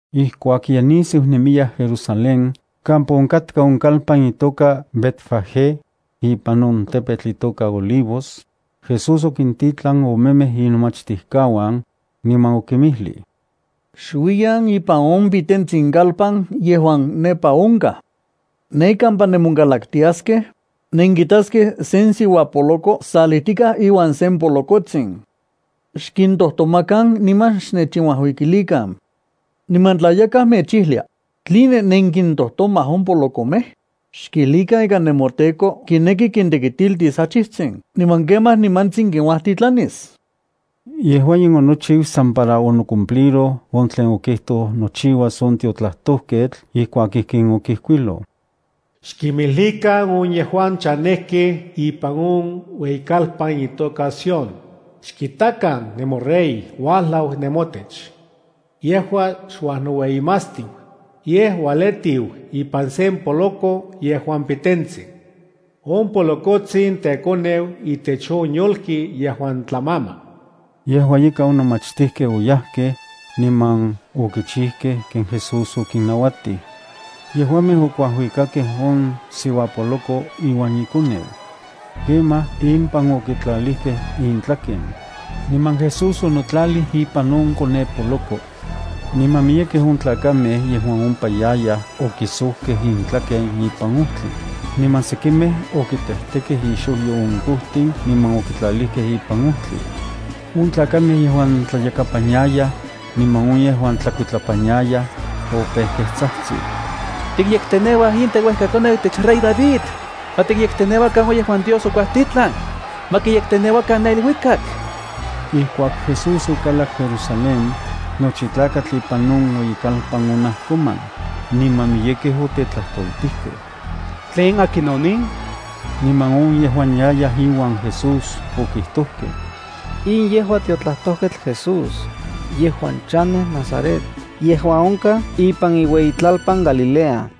Ijkuak ye nisiu nemiyaj Jerusalén kampa onkatka on kalpan itoka Betfagé, ipan on tepetl itoka Olivos, Jesús okintitlan omemej inomachtijkauan, niman okinmijlij: —Xuiyan ipan on pitentsin kalpan yejuan nepa onkaj. Ne kampa nemonkalaktiaskej, nenkitaskej sen siuapoloko salijtikaj iuan sen polokotsin. Xkintojtomakan niman xnechinuajuikilikan. Niman tla yakaj mechijlia: “¿Tline nenkintojtomaj on polokomej?”, xkijlikan ika nemoTEKO kineki kintekitilis achijtsin niman kemaj nimantsin kinkuajtitlanis. Yejua in onochiu san para onocumpliroj on tlen okijtoj nochiuas on tiotlajtojketl ijkuak ijkin okijkuiloj: “Xkinmijlikan on yejuan chanejkej ipan on ueyikalpan itoka Sión: Xkitakan, nemoRey uajlau nemotech. Yejua xuajnoueyimatstiu, yej ualetiu ipan sen poloko yejuan pitentsin. On polokotsin tekoneu itech on yolki yejuan tlamama.” Yejua ika, on nomachtijkej oyajkej, niman okichijkej ken Jesús okinnauatij. Yejuamej okuajuikakej on siuapoloko iuan ikoneu. Kemaj impan okintlalijkej intlaken, niman Jesús onotlalij ipan on konepoloko. Niman miyekej on tlakamej yejuan ompa yayaj okisojkej intlaken ipan ojtli, niman sekimej okitejtekej ixojyo on kojtin niman okitlalijkej ipan ojtli. On tlakamej yejuan tlayakapan yayaj, niman on yejuan tlakuitlapan yayaj, opejkej tsajtsij: —¡Tikyekteneuaj in teuejkakoneu itech rey David! ¡On yejuan uajlau, kipiya itlatiochiualis Dios! ¡Ma kiyekteneuakan ne iluikak! Ijkuak Jesús okalak Jerusalén, nochi tlakatl ipan on ueyikalpan onajkoman, niman miyekej otetlajtoltikej: —¿Tlen akinon in? Niman on yejuan yayaj iuan Jesús okijtojkej: —In yejua tiotlajtojketl Jesús, yejuan chanej Nazaret yejuan onkaj ipan iueyitlalpan Galilea.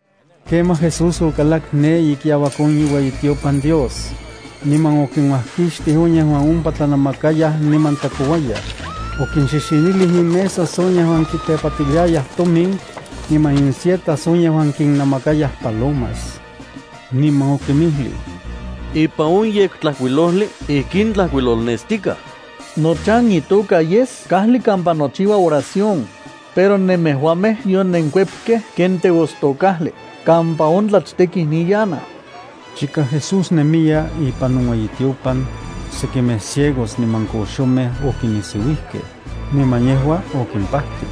Kemaj Jesús okalak ne ikiauak on iueyitiopan Dios, niman okinuajkixtij on yejuan ompa tlanamakayaj niman tlakouayaj. Okinxixinilij inmesas on yejuan kitepatiliayaj tomin, niman insietas on yejuan kinnamakayaj palomas. Niman okinmijlij: —Ipan on Yektlajkuilojli, ijkin tlajkuilolnestikaj: “Nochan itoka yes kajli kampa nokichiua oración”, pero nemejuamej yonenkuepkej ken teostokajli kampa on tlachtekij niyanaj. Chika Jesús nemiya ipan on ueyitiopan, sekimej ciegos niman koxomej okinisiuijkej, niman yejua okimpajtij.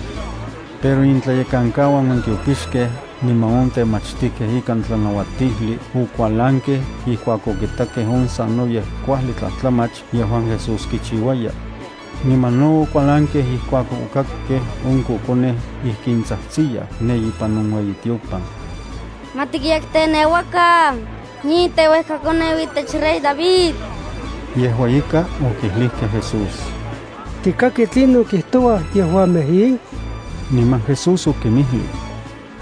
Pero intlayekankauan on tiopixkej niman on temachtijkej ikan tlanauatijli okualankej ijkuak okitakej on sanoyej kuajli tlajtlamach yejuan Jesús kichiuaya. Niman no okualankej ijkuak okakkej on kokonej ijkin tsajtsiyaj ne ipan on ueyitiopan: “¡Ma tiyekteneuakan in teuejkakoneu itech rey David!” Yejua ika okijlijkej Jesús: —¿Tikaki tlinon kijtouaj yejuamej in? Niman Jesús okinmijlij: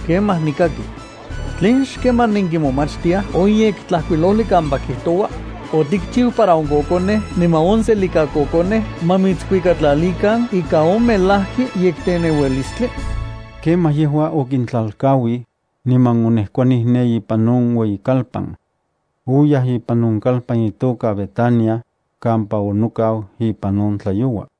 —Kemaj nikaki. ¿Tlen xkaman nenkimomachtiaj on Yektlajkuilojli kampa kijtoua: “Otikchiu para on kokonej niman on selikakokonej ma mitskuikatlalikan ika on melajki yekteneualistli”? Kemaj yejua okintlalkauij, niman onejkuanij ne ipan on ueyikalpan. Oyaj ipan on kalpan itoka Betania, kampa onokau ipan on tlayoua.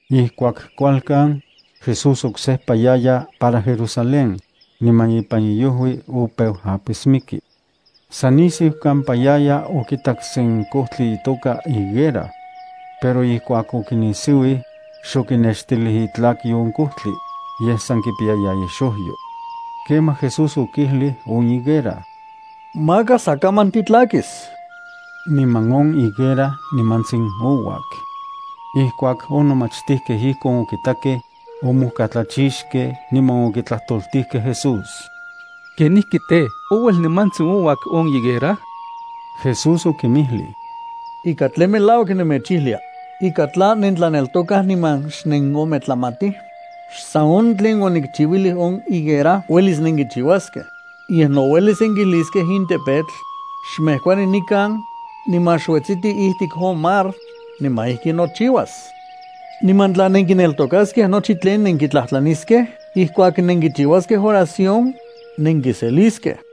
Ijkuak kualkan, Jesús oksejpa yaya para Jerusalén, niman ipan iojui opeu apismiki. San nisiu kampa yaya okitak sen kojtli itoka higuera. Pero ijkuak okinisiuij, xokinextilij itlakyo on kojtli, yej san kipiyaya ixojyo. Kemaj Jesús okijlij on higuera: —¡Maka sa kaman titlakis! Niman on higuera nimantsin ouak. Ijkuak on nomachtijkej ijkon okitakej, omojkatlachixkej niman okitlajtoltijkej Jesús: —¿Kenijki tej, ouel nimantsin ouak on higuera? Jesús okinmijlij: —Ika tlen melauak nemechijlia, ika tla nentlaneltokaj niman xnenometlamatij, xsan on tlen onikchiuilij on higuera uelis nenkichiuaskej, yej no uelis nenkijliskej in tepetl: “Xmejkuanij nikan, niman xuetsiti ijtik on mar”, niman ijki nochiuas. Niman tla nenkineltokaskej nochi tlen nenkitlajtlaniskej ijkuak nenkichiuaskej oración, nenkiseliskej.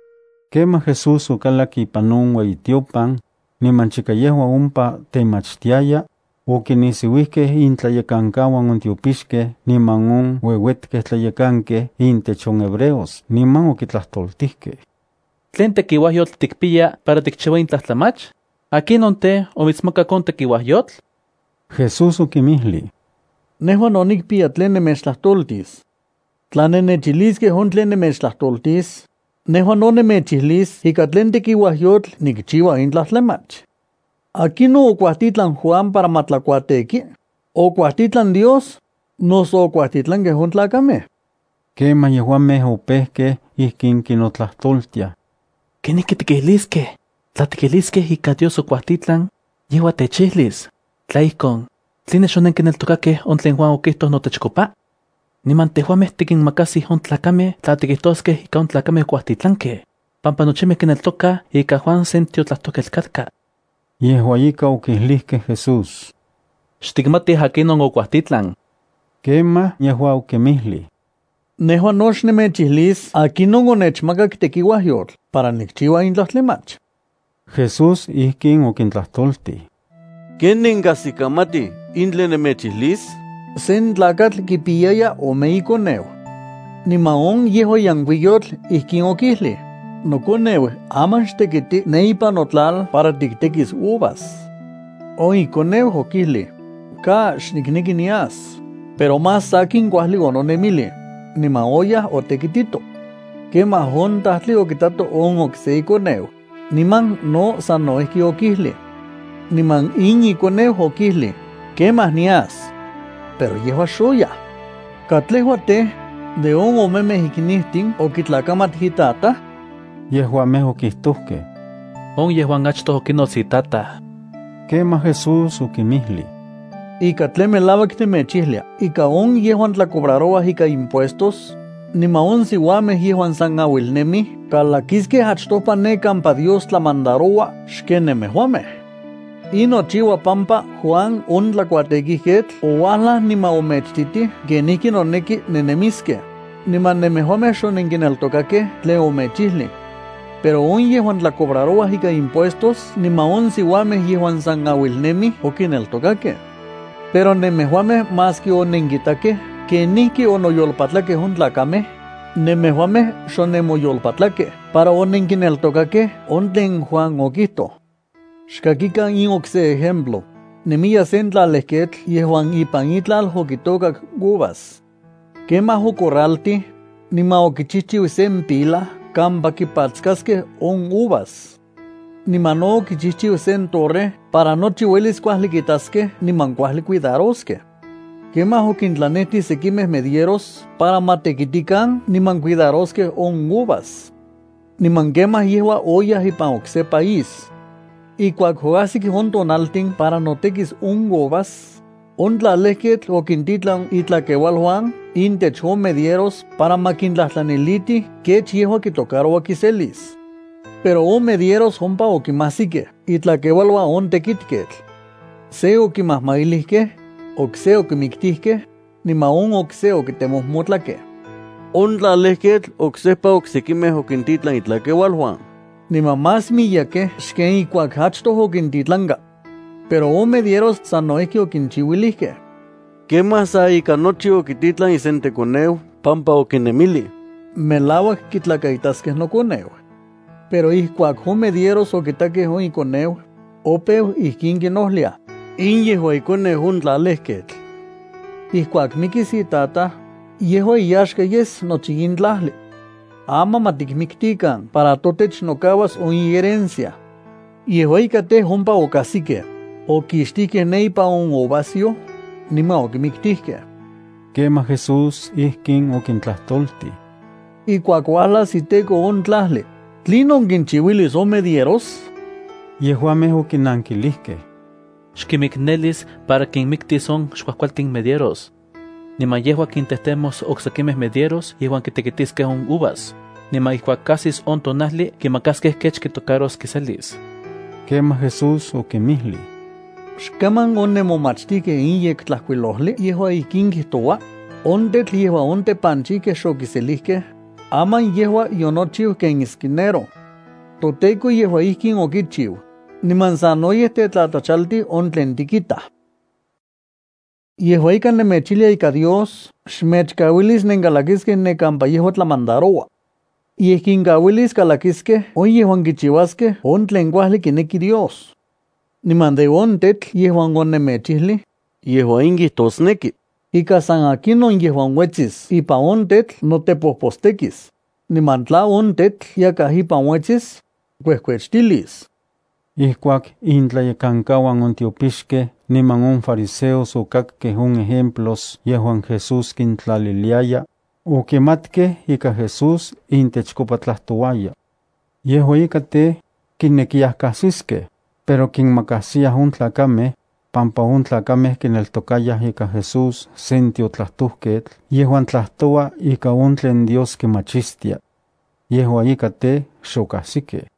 Kemaj Jesús okalak ipan on ueyitiopan, niman chika yejua ompa temachtiaya, okinisiuijkej intlayekankauan on tiopixkej niman on ueuetkej tlayekankej intech on hebreos niman okitlajtoltijkej: —¿Tlen tekiuajyotl tikpiya para tikchiua in tlajtlamach? ¿Akinon tej, omitsmakak on tekiuajyotl? Jesús okinmijlij: —Nejua no nikpiya tlen nemechtlajtoltis. Tla nennechijliskej on tlen nemechtlajtoltis, nejua no nemechijlis ika tlen tekiuayotl nikchiua in tlajtlamach. ¿Akinon okuajtitlan Juan para ma tlakuateki? ¿Okuajtitlan Dios, noso okuajtitlankej on tlakamej? Kemaj yejuamej opejkej ijkin kinotlajtoltiaj: —¿Kenijki tikijliskej? Tla tikijliskej ika Dios okuajtitlan, yejua techijlis: “Tla ijkon, ¿tline xonenkineltokakej on tlen Juan okijtoj notechkopa?” Niman tejuamej tikinmakajsij on tlakamej tla tikijtoskej ika on tlakamej okuajtitlankej, pampa nochimej kineltokaj ika Juan sen tiotlajtojketl katka. Yejua ika okijlijkej Jesús: —Xtikmatij akinon okuajtitlan. Kemaj yejua okinmijlij: —Nejua no xnemechijlis akinon onechmakak tekiuajyotl para nikchiua in tlajtlamach. Jesús ijkin okintlajtoltij: —¿Ken nenkajsikamatij de in tlen nemechijlis? Sen tlakatl kipiyaya ome ikoneu. Niman on yejuan yenkuiyotl ijkin okijlij: “Nokoneu, aman xtekititi ne ipan notlal para tiktekis uvas.” On ikoneu okijlij: “¡Ka! ¡Xnikneki nias!” Pero más sakin kuajli ononemilij, niman oyaj otekitito. Kemaj on tajtli okitato on okse ikoneu, niman no sano ijki okijlij. Niman in ikoneu okijlij: “Kemaj nias.” Pero yejua xoyaj. ¿Katlejua tej, de on omemej iknijtin okitlakamat itataj? Yejuamej okijtojkej: —On yejuan achtoj okinots itataj. Kemaj Jesús okinmijlij: —Ika tlen melauak nemechijlia ika on yejuan tlacobrarouaj ikan impuestos, niman on siuamej yejuan san auilnemij kalakiskej achtopa ne kampa Dios tlamandaroua xken nemejuamej. In nochiua pampa Juan on tlakuatekijketl ouajlaj niman omechititij kenijki noneki nennemiskej, niman nemejuamej xonenkineltokakej tlen omechijlij. Pero on yejuan tlacobrarouaj ikan impuestos niman on siuamej yejuan san auilnemij okineltokakej. Pero nemejuamej maski onenkitakej kenijki onoyolpatlakej on tlakamej, nemejuamej xonemoyolpatlakej para onenkineltokakej on tlen Juan okijtoj. ’Xkakikan in okse ejemplo: Nemiya sen tlalejketl yejuan ipan itlal okitôkak uvas. Kemaj ocorraltij, niman okichijchiu sen pila kampa kipatskaskej on uvas. Niman no okichijchiu sen torre para nochi uelis kuajli kitaskej niman kuajli cuidaroskej. ’Kemaj okintlanetij sekimej medieros para ma tekitikan niman cuidaroskej on uvas. Niman kemaj yejua oyaj ipan okse país. Ijkuak oajsik on tonaltin para notekis on uvas, on tlalejketl okintitlan itlakeualuan intech on medieros para ma kintlajtlanilitij kech yejua kitocaroua kiselis. Pero on medieros ompa okimajsikej itlakeualuan on tlalejketl. Se okimajmailijkej, okse okimiktijkej, niman on okse okitemojmotlakej. On tlalejketl oksejpa oksekimej okintitlan itlakeualuan, niman más miyekej xken ijkuak achtoj okintitlanka. Pero on medieros sano ijki okinchiuilijkej. Kemaj sa ika nochi okititlan isentekoneu pampa okinemilij: “Melauak kitlakaitaskej nokoneu.” Pero ijkuak on medieros okitakej on tekoneu, opeu ijkin kinojliaj: “In yejua ikoneu on tlalejketl. Ijkuak mikis itataj, yejua iyaxka yes nochi in tlajli. Aman ma tikmiktikan para totech nokauas on iherencia.” Yejua ika tej, ompa okajsikej; okixtijkej ne ipan on uvasyoj, niman okimiktijkej. Kemaj Jesús ijkin okintlajtoltij: —Ijkuak uajlas iteko on tlajli, ¿tlinon kinchiuilis on medieros? Yejuamej okinankilijkej: —Xkimiknelis para kinmiktis on xkuajkualtin medieros. Niman yejua kintejtemos oksekimej medieros yejuan kitekitiskej on uvas, niman ijkuak ajsis on tonajli kimakaskej kech kitocaros kiselis. Kemaj Jesús okinmijlij: —¿Xkaman onenmomachtikej in Yektlajkuilojli yejuan ijkin kijtoua? On tetl yejuan on tepanchijkej xokiselijkej, aman yejua yonochiu ken esquinero. ToTEKO yejua ijkin okichiu, niman sanoyej techtlatlachaltij on tlen tikitaj. Yejua ika nemechijlia ika Dios xmechkauilis nenkalakiskej ne kampa yejua tlamandaroua. Yej kinkauilis kalakiskej on yejuan kichiuaskej on tlen kuajli kineki Dios. Niman de on tetl yejuan onemechijlij, yejua in kijtosneki, ika san akinon yejuan uetsis ipan on tetl notepojpostekis, niman tla on tetl yakaj ipan onuetsis, kuejkuechtilis. Ijkuak intlayekankauan on tiopixkej niman on fariseos okakkej on ejemplos yejuan Jesús kintlaliliaya, okimatkej ika Jesús intechkopa tlajtouaya. Yejua ika tej, kinekiyaj kajsiskej, pero kinmakajsiyaj on tlakamej, pampa on tlakamej kineltokayaj ika Jesús sen tiotlajtojketl yejuan tlajtoua ika on tlen Dios kimachistia. Yejua ika tej, xokajsikej.